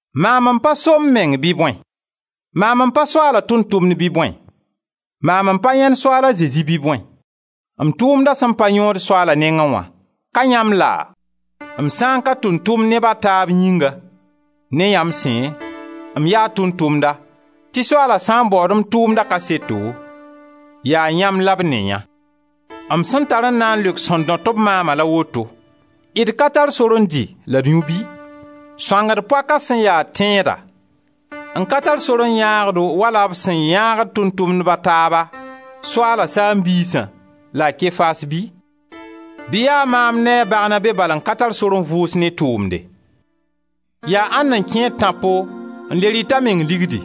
Maam n pa so m meng bɩ bõe? Maam n pa Soaala tʋʋm-tʋmd bɩ bõe? Maam n pa yãend Soaal a Zezi bɩ bõe? M tʋʋmdã sẽn paam yõod Soaala nengẽ wã, ka yãmb laa? M sã n ka tʋʋm-tʋmd neb a taab yĩnga, ne yãmb sẽ, m yaa tʋʋm-tʋmda, tɩ Soaala sã n baood m tʋʋmda kaseto, yaa yãmb la b ne yã. M sẽn tar n na n leok sẽn dõt-b maama la woto: d ka tar sor n dɩ la d yũ bɩ? Sõangd poaka sẽn ya tẽeda n ka tar sor n yãag-do wala b sẽn yãagd tʋʋm-tʋmdb a taaba, Soaala saam-biisã, la a Kefas bɩ? Bɩ yaa maam ne a Barnabe bal n ka tar sore n vʋʋs ne tʋʋmde? Yaa ãnd n kẽed tãpo n le rɩt a meng ligdi?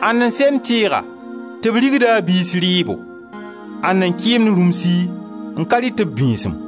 Ãnda n send tɩɩga tɩ b rigd a biis rɩɩbo? Ãnda n kɩɩmd rũmsi n ka rɩt b bĩisim?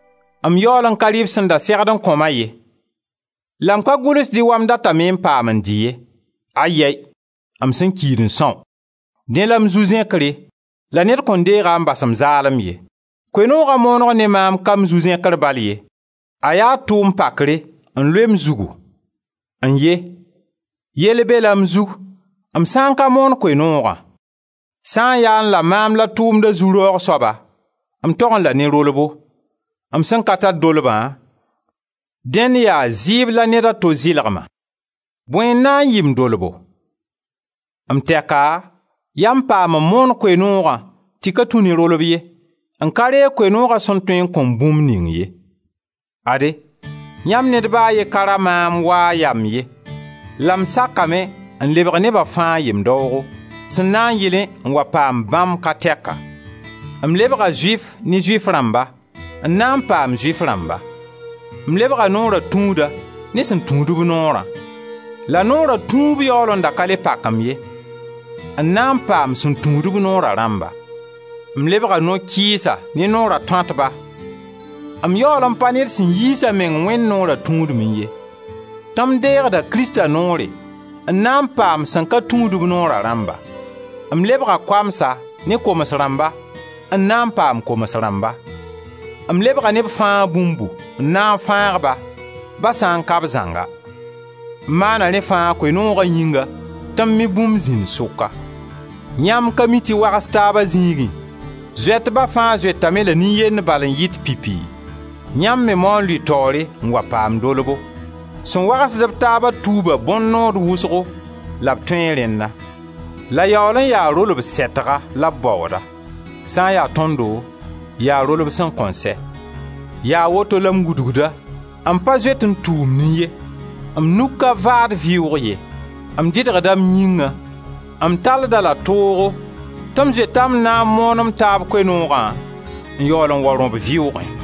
M yaool n ka rɩ b sẽn da segd n kõ-ma ye. La m ka gʋlsd-y wa m datame n paam n dɩ-y ye. Ayɛy! M sẽn kiid n são. Dẽ la m zu-zẽkre la ned kõn deeg-a n bas m zaalem ye. Koe-nooga mooneg ne maam ka m zu-zẽkr bal ye, a yaa tʋʋm pakre n loe m zugu. N ye! Yell bela m zug, m sã n ka moon Koe-noogã! Sã n yaẽ la maam la tʋʋmda zu-raoogo soaba m togẽ la ne rolbo; m sã n ka tar dolbã, dẽnd yaa zɩɩb la neda to zɩlg-ma. Bõe n na n yɩ m dolbo? M tɛka yaa m paam n moon Koe-noogã tɩ ka tũ ne rolb ye, n ka reeg Koe-nooga sẽn tõe n kõ-m bũmb ning ye. Ade, yãmb ned ba a ye ka ra maam waa a yamb ye la m sakame n lebg neba fãa yem-daoogo, sẽn na n yɩlẽ n wa paam bãmb ka tɛka. M lebga Zʋɩf ne Zʋɩf rãmba, n na n paam Zʋɩf rãmba; m lebga Noora tũuda ne sẽn tũudb Noorã — la Noora tũub yaool n da ka le pak-m ye — n na n paam sẽn tũud-b Noora rãmba. M lebga no-kɩɩsa ne Noora tõatba — m yaool n pa ned sẽn yiis a meng Wẽnd Noora tũudmẽ ye, tɩ m deegda Krista Noore — n na n paam sẽn ka tũud-b Noora rãmba. M lebga koamsa ne koms rãmba n na n paam koms rãmba. M lebga neb fãa bũmbu, n na n fãag-ba, ba sã n ka b zãnga. M maana rẽ fãa Koe-nooga yĩnga tɩ m me bũmb zĩnd sʋka. Yãmb ka mi tɩ wags taaba zĩigẽ, zoetba fãa zoetame la yaa nin-yend bala n yɩt pipi? Yãmb me mao n lʋɩ taoore n wa paam dolbo. Sẽn wagsd-b taaba tuuba bõn-nood wʋsgo la b tõee rẽnna. La yaool n yaa rolb sɛtga la b baooda. Sã n ya tõndo yaa rolb sẽn kõn sɛ. Yaa woto la m wudgda, m pa zoet n tuumnẽ ye, m nug ka vaad vɩʋʋg ye. M dɩdgda m yĩngã, m talld-a-la toogo tɩ m zoeta m na n moon m taab Koe-noogã n yaool n wa rõb vɩʋʋgẽ.